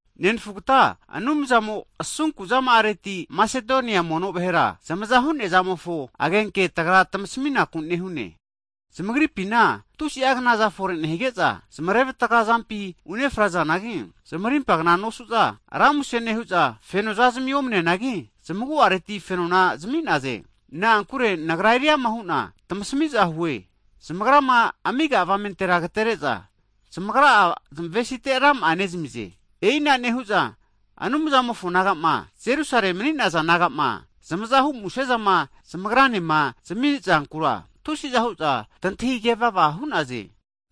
Nenfugata, Anumzamo asunku'zama'areti, Masedonia mono vahera zamaza hu'nea zamofo agenke tagra tmasaminaku nehune. Zamagripina tusi'a knaza fore nehige'za, zmarevatga zampi ufrenazanagi, zmarimpa kna nosu'za, ra muse nehu'za, fenozami omneneanagi, zamagu'areti fenona zami'naze. Na'ankure nagra eriama hu'na tamasmiza hue, zamagrama amiga'a avamentera agatere'za, zamagra'a zmavesite rama'a nezamize. E'ina nehu'za, Anumzamofo naga'ma Jerusale mni'naza naga'ma, zamazahu muse'zama zamagranema zamizankura, tusiza hu'za tantahigevava hu'naze.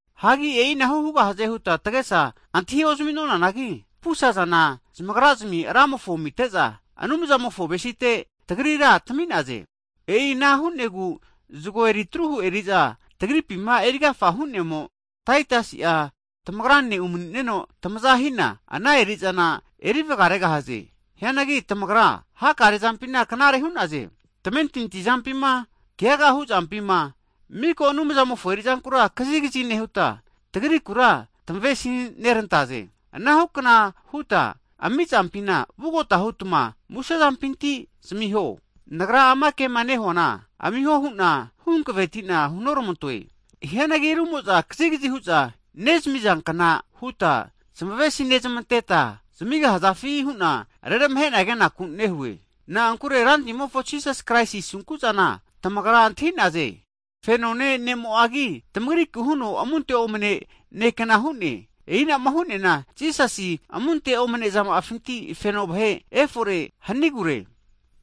Hagi e'inahu hugahaze huta tagesa antahi ozamunanagi, pusazana zamagrazmi Ramofo amite'za, Anumzamofo avesite tagrira tami'naze. E'i ana hu'negu zgo eritruhu eri'za tagripima erigafa hu'nemo, Taitusi'a tamagrane umani'neno tamazahina, ana erizana eri vgaregahaze. Hianagi tamagra hakare zampina knare hu'naze, tamentinti zampima, kegaga huzampima, mika Anumzamofo erizankura kazigazi nehuta, tagrikura tamavesi nerantaze. Ana hukana huta amizampina vugota hutma muse'zampinti zamiho. Nagra ama kema nehuana, amiho hu'na huhankvetina hunormantoe. Hianagi rumo'za kazigazi hu'za nezamizankna huta zmavesinezmenteta, zamigahazafi hu'na reramahena kenaku nehue. Na'ankure Rantimofo Jisasi Kraisi asunku'zana tamagra antahi'naze. Fenone nemo'agi, tamagriku huno amunte omne nekna hu'ne, e'i anama hu'neana Jisasi amunte omnezama'afinti feno vahe tamazeri feno vahe fore hanigure.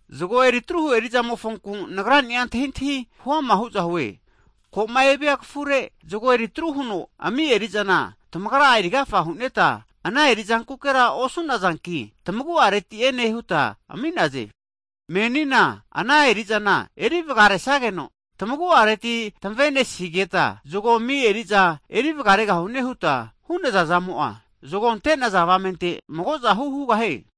Zago eritruhu erizamofonku nagrani'a antahiantahi hu'ama huzahue. Koma evia kafure zgo eritru huno ami eri'zana tamagra'a erigafa huneta, ana erizankukera osunazanki, tamagu'areti ene huta ami'naze. Menina ana erizana eri vagaresageno, tamagu'areti tamavenesigeta zgo ami eriza eri vagaregahune huta hu'nazazamo'a, zgo ante'naza avamente magozahu hugahie.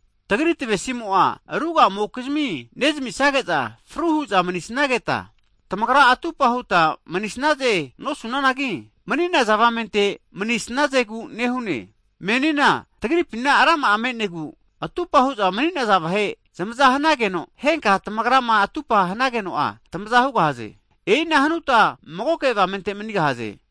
Tagri tavesimo'a ruga'amokizmi nezamisageza fru hu'za manisnageta, tamagra atupa huta manisnaze nosunanagi, mni'naza avamente manisnazegu nehune. Menina tamagripi rama'a me'negu, atupa hu'za mani'naza vahe zamaza hanageno, henka'a tamagrama atupa hanageno'a tamaza hugahaze. E'i ana hanuta magoke avamente manigahaze.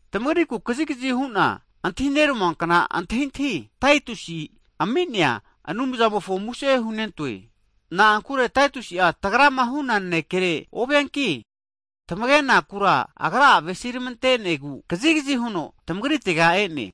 Tamagriku kazigazi hu'na antahi neramuankna antahintahi, Taitus ami'nea Anumzamofo muse hunentoe. Na'ankure Taitusi'a tagrama hu'na nanekereke ovianki, tamagenakura agra'a avesi'rmantenegu, kazigazi huno tamagritega e'ne.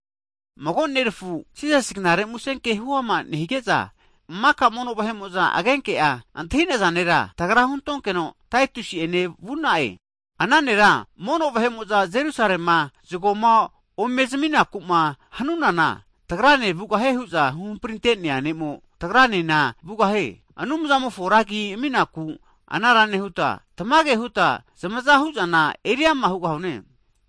Mago nerafu, Jisasi knare muse ke huama nehige'za maka mono vahe'mo'za agenke'a antahinaza nera, tagra huntonkeno Taitusi ene vu'na'e. Ana nera mono vahe'moza Jerusalema zgoma omezminaku'ma hanunana, tagrane vugahie hu'za huhamprintenea ne'mo, tagranena vugahie. Anumzamofo ra agi aminaku anara nehuta, tamage huta zamaza hu'zana eriama hugahune.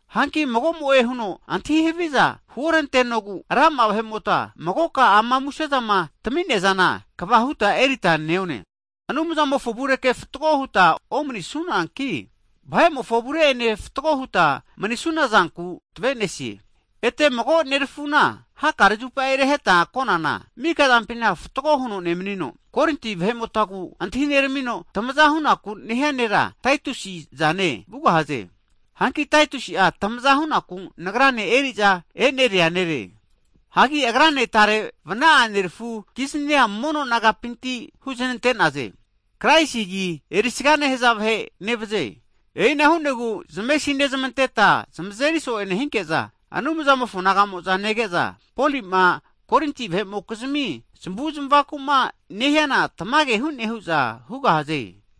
Hanki mago'mo'e huno antahi haviza huorantenogu, rama'a vahe'mota magoka ana musezama tami'neazana kva huta erita neone. Anumzamofo avurekera fatgo huta omanisunanki, vahemofo avure enena fatgo huta manisunazanku tavenesie. Ete mago nerafuna hakare zupa reheta konana, mikazampina fatgo huno nemnino, Korinti vahe'motagu antahineramino tmaza hunaku nehia nera, Taitusi zane vugahaze. Hanki Taitusi'a tmaza hu'naku nagrane eriza e'neria nere. Hagi agrane tare vna'a nerafukiznia mono nagapinti huznente'naze. Kraisi agi erisaga nehza vahe nevaze. E'ina hu'negu zamesi'nezmanteta zmazeri so'e nehinke'za, Anumzamofo nagamo'za nege'za, Poli'ma Korinti vahe'mokizmi zamavu'zmavaku'ma nehiana tamage hu'ne hu'za hugahaze.